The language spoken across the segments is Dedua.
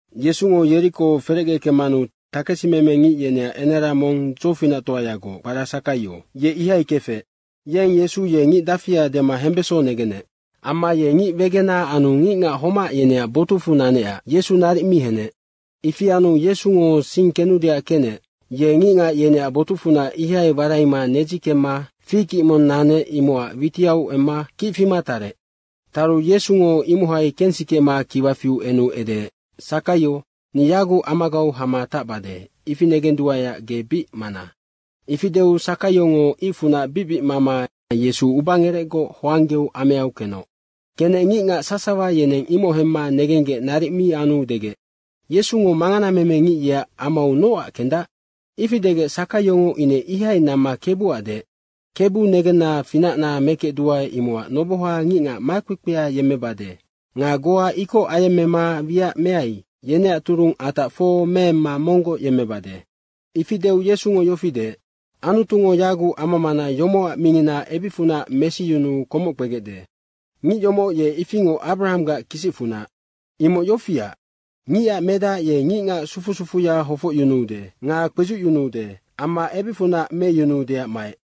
Yesungo Yeriko ferecge kemmanu takesimeme ngic yeneac enara mong dzofinactoayagoc, kpara Sakaio, ye ihai kefec. Yeng Yesu ye ngic dafia dema hembesonga negenec. Amma ye ngic wegena anu ngicngac homac yeneac botucfu nanecac Yesu naric mi henec. Ifi anu Yesungo sing kenudeac kenec, ye ngicngac yeneac botucfunac ihai waraima nedzi kemma fig ic mong nanec, imocac witiau emma kic fima tarec. Taru, Yesungo imohai kensikema kiwa fiu enu edeec, “Sakaio, ni yaguc amagau hama tacbade, ifi negenduaeac ge bic mana.” Ifi deu Sakaiongo icfunac bicbic mama Yesu ubangerecgoc hoanggeu ameau kenoc. Kenec ngicngac sasawa yeneng imoc hemma negenggec naric mi anu degec, “Yesungo manganamemengic yeac amau nocac kendac?” Ifi degec Sakaiongo ine ihai namma Kebuac deec, “Kebu negenna, finacna mekecduae, imocac noboha ngicngac makpekpea yemmebade nga goa ikoc ayemmema wiac meai, yeneac turung atac fo meemma monggoc yemmebade.” Ifi deu Yesungo yofi deec, “Anutungo yaguc ama mana yomocac mingina ebicfunac mesiyunuu komoc kpegecde. Ngic yomoc ye ifingoc Abrahanggac kisicfunac. Imoc yofiac, Ngicac Medac ye ngicngac sufu sufuya hofocyunuude nga kpedzucyunuude amma ebicfunac meyunuudeac maec.”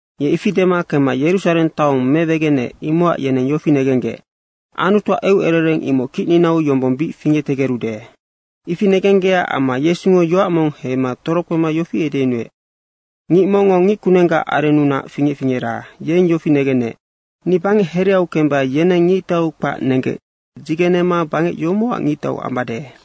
Ye ifi dema kemma Yerusareng taong mewegeneec, imocac yeneng yofi negenggec, “Anutuac eucerereng imoc kicninau yombong bic fingectegerude.” Ifi negenggecac amma Yesungo yoac mong heima torokpema yofi edeyunuec, “Ngic mongngo ngickunenggac arennunac fingec fingera, yeng yofi negenec, ‘Ni bangec hereau kemba yeneng ngictau kpac nenggec dzigenema bangec yomocac ngictau ambade.’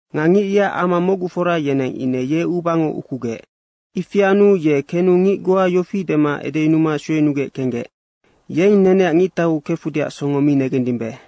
Nga ngic yeac ama mocgufora, yeneng ine ye ubango ukugec. Ifi anu ye kenu ngic goa yofi dema edeyunuma sueyunugec kenggec, ‘Yeng neneac ngictau kefudeac songo mi negendimbe.’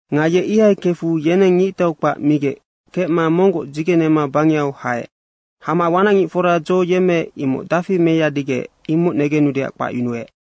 Nga ye ihai kefu yeneng ngictau kpac migec kecma monggoc dzigenema bangehau haec. Hama wanacngicfora dzo yemmeec, imoc dafi meyadigec, imoc negenudeac kpacyunuec.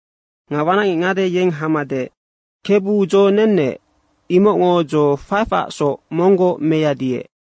Nga wanacngic ngade, yeng hama deec, ‘Kebu, dzo nennec, imocngo dzo 5acsoc monggoc meyadiec.’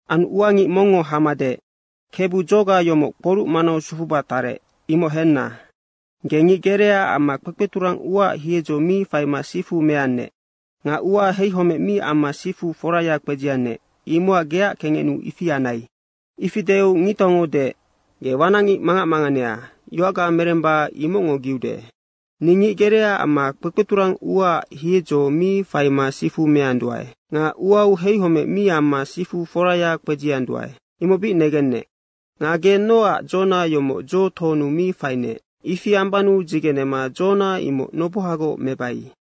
Anu ua ngic mongngo hama deec, ‘Kebu, dzoga yomoc kporuc manau sufuba tarec, imoc henna. Ge ngic gerea amma kpekpeturang uaac hiedzo mi faima sifu meannec. Nga uau heihomec mi amma sifu foraya kpedziannec, imocac geac kengecnuu ifi anai.’ Ifi deu ngictaungo deec, ‘Ge wanacngic mangac manganea, yoacga meremba imocngo giude. Ni ngic gerea amma kpekpeturang uaac hiedzo mi faima sifu meanduae. Nga uau heihomec mi amma sifu foraya kpedzianduae, imoc bic negennec. Nga ge nocac dzona yomoc dzo tohonu mi fainec? Ifi ambannu dzigenema dzona imoc nobohagoc mebai.’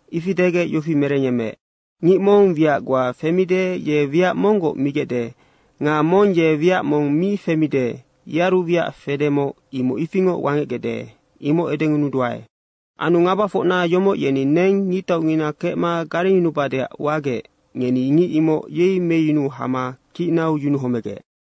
Ifi degec yofi merengyemmeec, ‘Ngic mong wiac goa femide, ye wiac monggoc migecde nga mong ye wiac mong mi femide, yearu wiac fedemoc, imoc ifingoc wangecgecde, imoc edengunuduae. Anu ngabafocna yomoc yeni neng ngictaungina kecma garengyunubadeac wagec, ngeni ngic imoc yei meyunu hama kicnau yunuhomegec.’”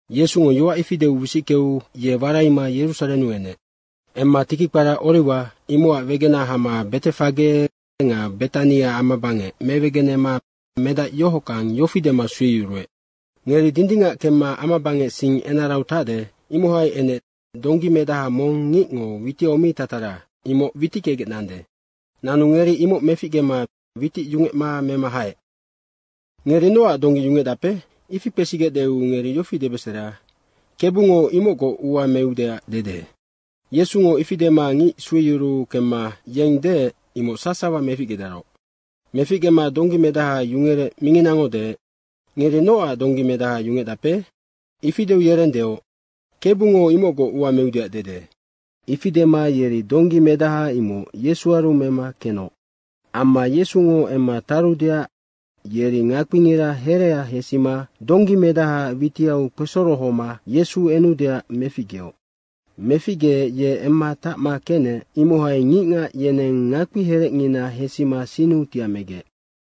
Yesungo yoac ifi deu wisickeu ye waraima Yerusarennu enec. Emma tiki kpara Oriwa, imocac wegena hama Betefage nga Betania amabangec mewegenema medac yohockang, yofi dema sueyuruec. “Ngeri dindingac kemma amabangec sing enarau tacde, imohai enec donggi medaha mong ngicngo witiau mi tatara, imoc witickegec nande. Nanu ngeri imoc meficgema witic yungecma mema haec. ‘Ngeri nocac donggi yungecdape?’ Ifi kpesigecdeu ngeri yofi debesera, ‘Kebungo imocgoc ua meudeac dede.’” Yesungo ifi dema ngic sueyuruu kemma yeng deec, imoc sasawa meficgedaroc. Meficgema donggi medaha yungerec minginango deec, “Ngeri nocac donggi medaha yungecdape?” Ifi deu yereng deoc, “Kebungo imocgoc ua meudeac dede.” Ifi dema yeri donggi medaha imoc Yesuaru mema kenoc. Amma Yesungo emma tarudeac yeri ngakpingira herea hesima donggi medahaac witiau kpesorohoma Yesu enudeac meficgeoc. Meficgeec ye emma tacma kenec, imohai ngicngac yeneng ngakpiherecngina hesima sinnu tiamegec.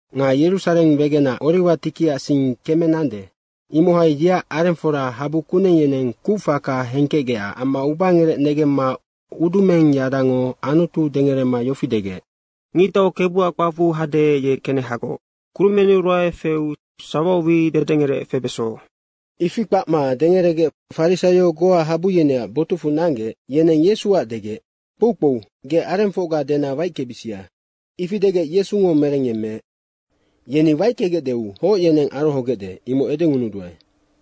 Nga Yerusareng wegenac Oriwa tikiac sing keme nande, imohai yeac arengfora habu kuneng yeneng kucfaka hengkecgecac amma ubangerec negemma udumengyadango Anutu dengerema yofi degec, “Ngictau Kebuac kpacfu hade, ye kenehagoc. Kurumennu ruae feu sawau wi dedengerec febeso.” Ifi kpacma dengeregec farisaio goa habu yeneac botucfu nanggec, yeneng Yesuac degec, “Kpoukpou, ge arengfocga dena waickebisia.” Ifi degec Yesungo merengyemmeec, “Yeni waickegecdeu hoc yeneng arohogecde, imoc edengunuduae.”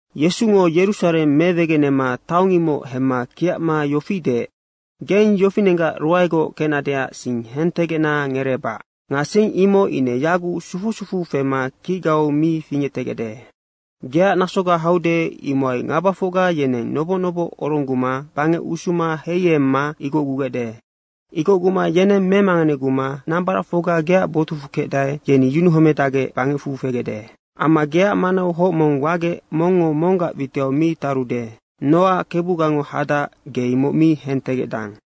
Yesungo Yerusareng mewegenema taong imoc hemma kiacma yofi deec, “Geng yofinenggac ruaegoc kecnadeac sing hentegecna ngereebac. Nga sing imoc ine yaguc sufu sufu fema kicgau mi fingectegecde. Geac nasoga haude, imohai ngabafocga yeneng noboc noboc orongguma bangec usuma heiemma igocgugecde. Igocguma yeneng memanganeguma nambaracfocga geac botucfu kecdae, yeni yunuhomedacgec bangecfu fegecde. Amma geac manau hoc mong wagec mongngo monggac witiu mi tarude, nocac Kebugango hadac, ge imoc mi hentegecdang.”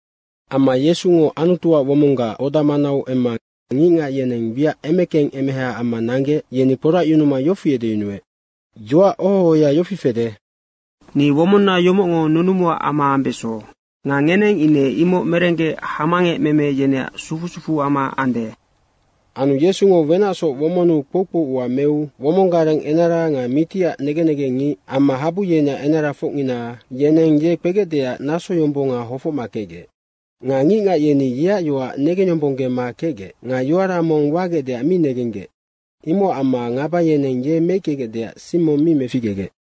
Amma Yesungo Anutuac womonggac oda manau emma ngicngac yeneng wiac emekeng emeha amma nanggec, yeni kporacyunuma yofi edeyunuec, “Yoac oho ohoya yofi fede, ‘Ni womonna yomocngo nunumuac ama ambeso.’ Nga ngeneng ine imoc merenggec hamangecmeme yeneac sufu sufuama ande.” Anu Yesungo wenacsoc womonnu kpoukpou ua meu womong gareng enara nga mitiac negen negengngic amma habu yeneac enarafocngina yeneng ye kpegecdeac nasoyombonga hofocma kecgec. Nga ngicngac yeni yeac yoac negengyombonggema kecgec nga yoara mong wagecdeac mi negenggec. Imocac amma ngaba yeneng ye meickegecdeac sing mong mi meficgegec.